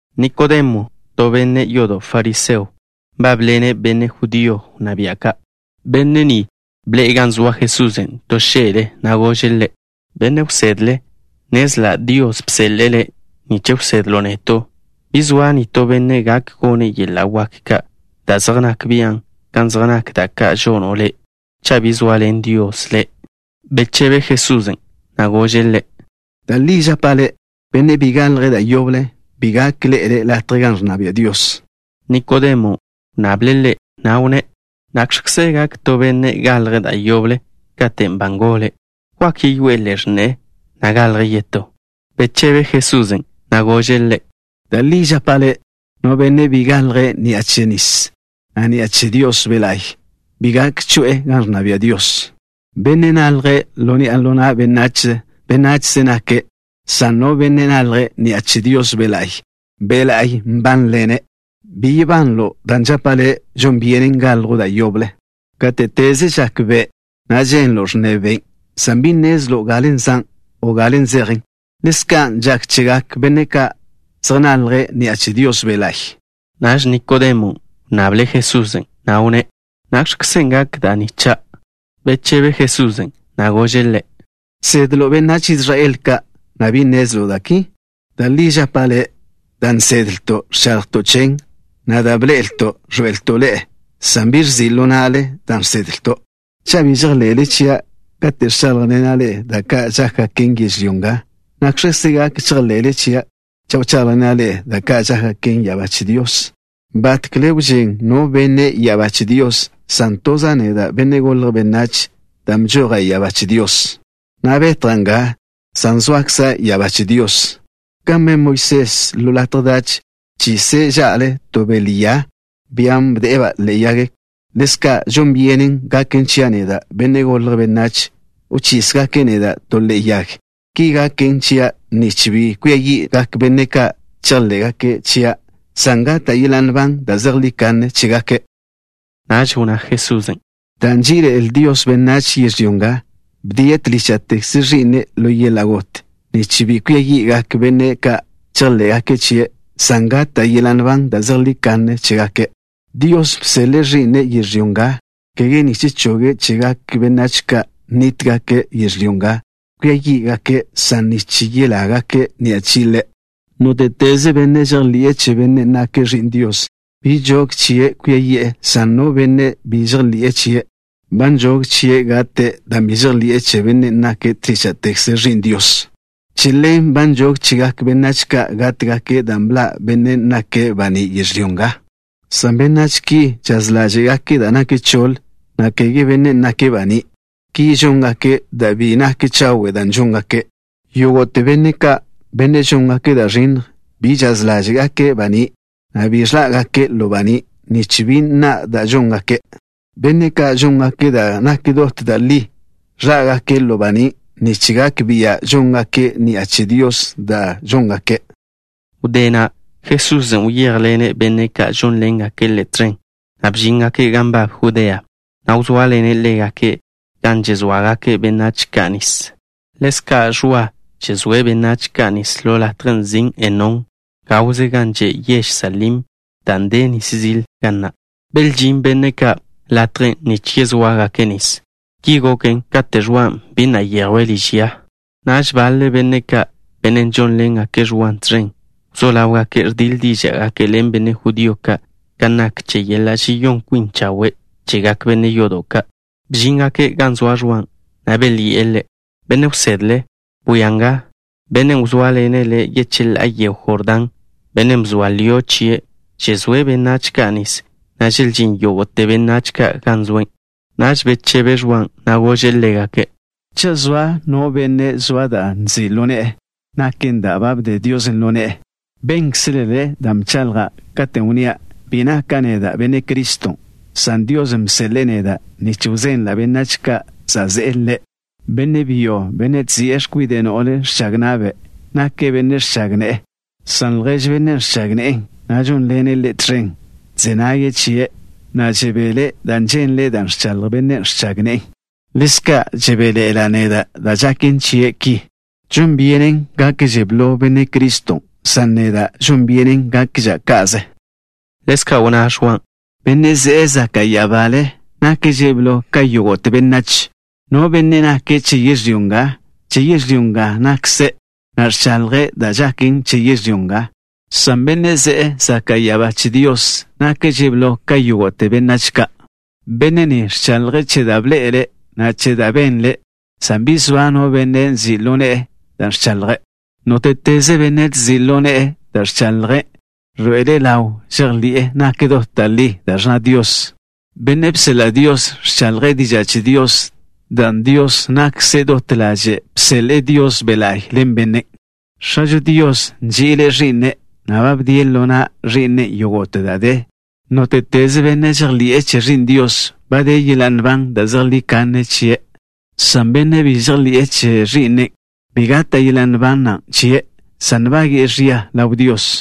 Nikodemo, to benne' yodo' fariseo, nbábḻene' benne' judío wnná bia' ka'. Benne' ni bḻe'e gan zoa Jesusen' to xe'le, na' gože' Ḻe': —Benne' Wsedle. Nnezla' Dios bseḻe'e Le' nich wsedlo' neto'. Bi zoa no benne' gak gone' yeḻa' wak ka', da' zej nak bian', kan zej nak da' ka' žono' Le', cha' bi zoaḻen Dios ḻe'. Bechebe Jesusen', na' gože' ḻe': —Da' li žapa' le', no benne' bi galje' da' yoble, bi gak ḻe'ele' latjen' gan ẕnna bia' Dios. Nikodemon' wnnable' Ḻe', na' wnné': —¿Nakx̱kze gak to benne' galje' da' yoble katen' ba ngole'? ¿Wak yeyoé'e ḻe'e x̱ne'e, na' galje' yetó? Bechebe Jesusen', na' gože' ḻe': —Da' li žapa' le'. No benne' bi galje' ni'a che nis, na' ni'a che Dios Be' La'y, bi gak choe'e gan ẕnna bia' Dios. Bennen' nalje' ḻo ni'a ḻo na' benách, benachze nake', san no benne' nalje' ni'a che Dios Be' La'y, Be' La'y nbánḻene'. Bi yebanlo' dan' žapa' le', žon byenen galjo' da' yoble. Gáte'teze žak be', na' ženlo' ẕnne ben', san bi nnezlo' galen' zan', o galen' zejen. Ḻezka' žak chegak benne' ka' zej nalje' ni'a che Dios Be' La'y. Naž Nikodemon' wnnable' Jesusen', na' wnné': —¿Nakx̱kzen' gak da' ni, cha'? Bechebe Jesusen', na' gože' ḻe': —¿Žsedlo' benách Israel ka', na' bi nnezlo' da' ki? Da' li žapa' le', da' nnezlto' ẕchaḻjto' chen, na' da' bḻe'elto' ẕḻoe'elto' ḻe'e, san bi ẕzi' ḻo na'le dan' žsedlto'. Cha' bi žejḻe'le chia' kate' ẕcháḻjḻena' ḻe'e kan zej nak da' ka' žákgaken yežlyó nga, ¿nakx̱kze gak chejḻe'le chia' cha' wcháḻjḻena' ḻe'e che da' ka' žákgaken ya'abá che Dios? ’Batkle wžén no benne' ya'abá che Dios, san toza' neda', Benne' Golje' Benách, dan' bžoja' ya'abá che Dios, na' betja' nga, san zoakza' ya'abá che Dios. Kan ben Moisés ḻo latje dach, bchise' ža'le to bele ya, bian' bde'e-ba' ḻe'e yag, ḻezka' žon byenen gaken chia' neda', Benne' Golje' Benách, wchísgake' neda' to ḻe'e yag. Ki gaken chia', nich bi kwia yi'gak benne' ka' chejḻé'gake' chia', san gata' yeḻa' nban da' zejlí kanne chégake'. Naž wnná Jesusen': —Dan' nží'iḻe'el Dios benách yežlyó nga, bdie' tlícha'tekze Ẕi'ne' ḻo yeḻa' got, nich bi kwia yi'gak benne' ka' chejḻé'gake' chie', san gata' yeḻa' nban da' zejlí kanne chégake'. Dios bseḻe'e Ẕi'ne' yežlyó nga, kege nich choge' chegak benách ka' nníta'gake' yežlyó nga kwia yí'gake', san nich yelágake' ni'a chie' Ḻe'. ’Nóte'teze benne' žejḻi'e che Bennen' nake' Ẕi'n Dios, bi nžog chie' kwia yi'e, san no benne' bi žejḻi'e chie', ba nžog chie' gate' dan' bi žejḻi'e che Bennen' nake' tlícha'tekze Ẕi'n Dios. Che ḻen ba nžog chegak benách ka' gátgake', dan' bḻa' Bennen' nake' baní' yežlyó nga, san benách ki žaz ḻáže'gake' da' nak choḻ, na' kege Bennen' nake' baní'. Ki žóngake' dan' bi nak chawe' da' žóngake'. Yógo'te benne' ka', benne' žóngake' da' ẕinnj, bi žaz ḻáže'gake' baní', na' bi ẕḻá'gake' ḻo baní', nich bi nna' da' žóngake'. Benne' ka' žóngake' da' nak dot da' li, ẕḻá'gake' ḻo baní' nich gak bia' žóngake' ni'a che Dios da' žóngake'. Wdé na', Jesusen' wyéjḻene' benne' ka' žónḻengake' Ḻe' tẕen, na' bžíngake' gan nbab Judea, na' wzóaḻene' ḻégake' gan žezóagake' benách ka' nis. Ḻezka' Ẕwa žezóe' benách ka' nis ḻo latjen' nzin' Enón, gawze gan že' yež Salim, dan' de nis zil ga na'. Belžín benne' ka' latjen' nich yezóagake' nis. Ki goken kate' Ẕwan' bi na' yejwe' liž ya. Naž baḻe benne' ka', benne' žónḻengake' Ẕwan' tẕen, wzó ḻáwgake' ẕdíḻ díža'gake' ḻen benne' judío ka' kan nak che yeḻa' žeyón kwin chawe' chegak benne' yodo' ka'. Bžíngake' gan zoa Ẕwan', na' belyi'e ḻe': —Benne' wsedle. Bwia nga. Bennen' wzóaḻene' le' yecheḻá'a yego Jordán, bennen' bzoa lio' chie', žezóe' benách ka' nis, na' želžín yógo'te benách ka' gan zoe'. Naž bechebe Ẕwan', na' gože' ḻégake': —Cha' zoa no benne' zoa da' nzi' ḻo ne'e, naken da' ba bde Dios ḻo ne'e. Bénkzelele dan' bchaḻja' katen' wnnía': “Bi naka' neda' Benne' Criston'” san Dios bseḻe'e neda' nich wzenla' benách ka' za' ze'e Ḻe'. Benne' byo, bennen' ẕzi'e x̱kwide' no'le ẕchag na'be', nake' benne' ẕchag ne'e, san ljež bennen' ẕchag ne'e, na' žónḻene' ḻe' tẕen, ẕze nage' chie', na' žebele' dan' ženle' da' ẕchaḻj bennen' ẕchag ne'e. Ḻezka' žebéḻe'ela' neda' dan' žaken chie' ki. Žon byenen gakže blo Benne' Criston', san žon byenen yéx̱jwža' neda'. Ḻezka' wnná Ẕwan': —Bennen' ze'e zaka' ya'abale nakže' blo ka yógo'te benách. No benne' nake' che yežlyó nga, che yežlyó nga nakze', na' ẕchaḻjze' che da' žaken yežlyó nga, san Bennen' ze'e zaka' ya'abá che Dios nakže' blo ka yógo'te benách ka'. Benne' ni ẕchaḻje' che da' bḻe'ele', na' che da' benle', san bi zoa no benne' ẕzi' ḻo ne'e dan' ẕchaḻje'. Nóte'teze benne' ẕzi' ḻo ne'e dan' ẕchaḻje', ẕḻoe'ele' ḻaw žejḻi'e nak dot da' li da' ẕnna Dios. Bennen' bseḻa' Dios, ẕchaḻje' diža' che Dios, dan' Dios na'kze dot ḻaže'e bseḻe'e Dios Be' La'y ḻen Bennen'. X̱ažo Dios nži'ile' Ẕi'ne', na' ba bdie' ḻo na' Ẕi'nen' yógo'te da' de. Nóte'teze benne' žejḻi'e che Ẕi'n Dios, ba de yeḻa' nban da' zejlí kanne chie', san bennen' bi žejḻi'e che Ẕi'nen', bi gata' yeḻa' nban na' chie', san nbage'e ẕia ḻaw Dios.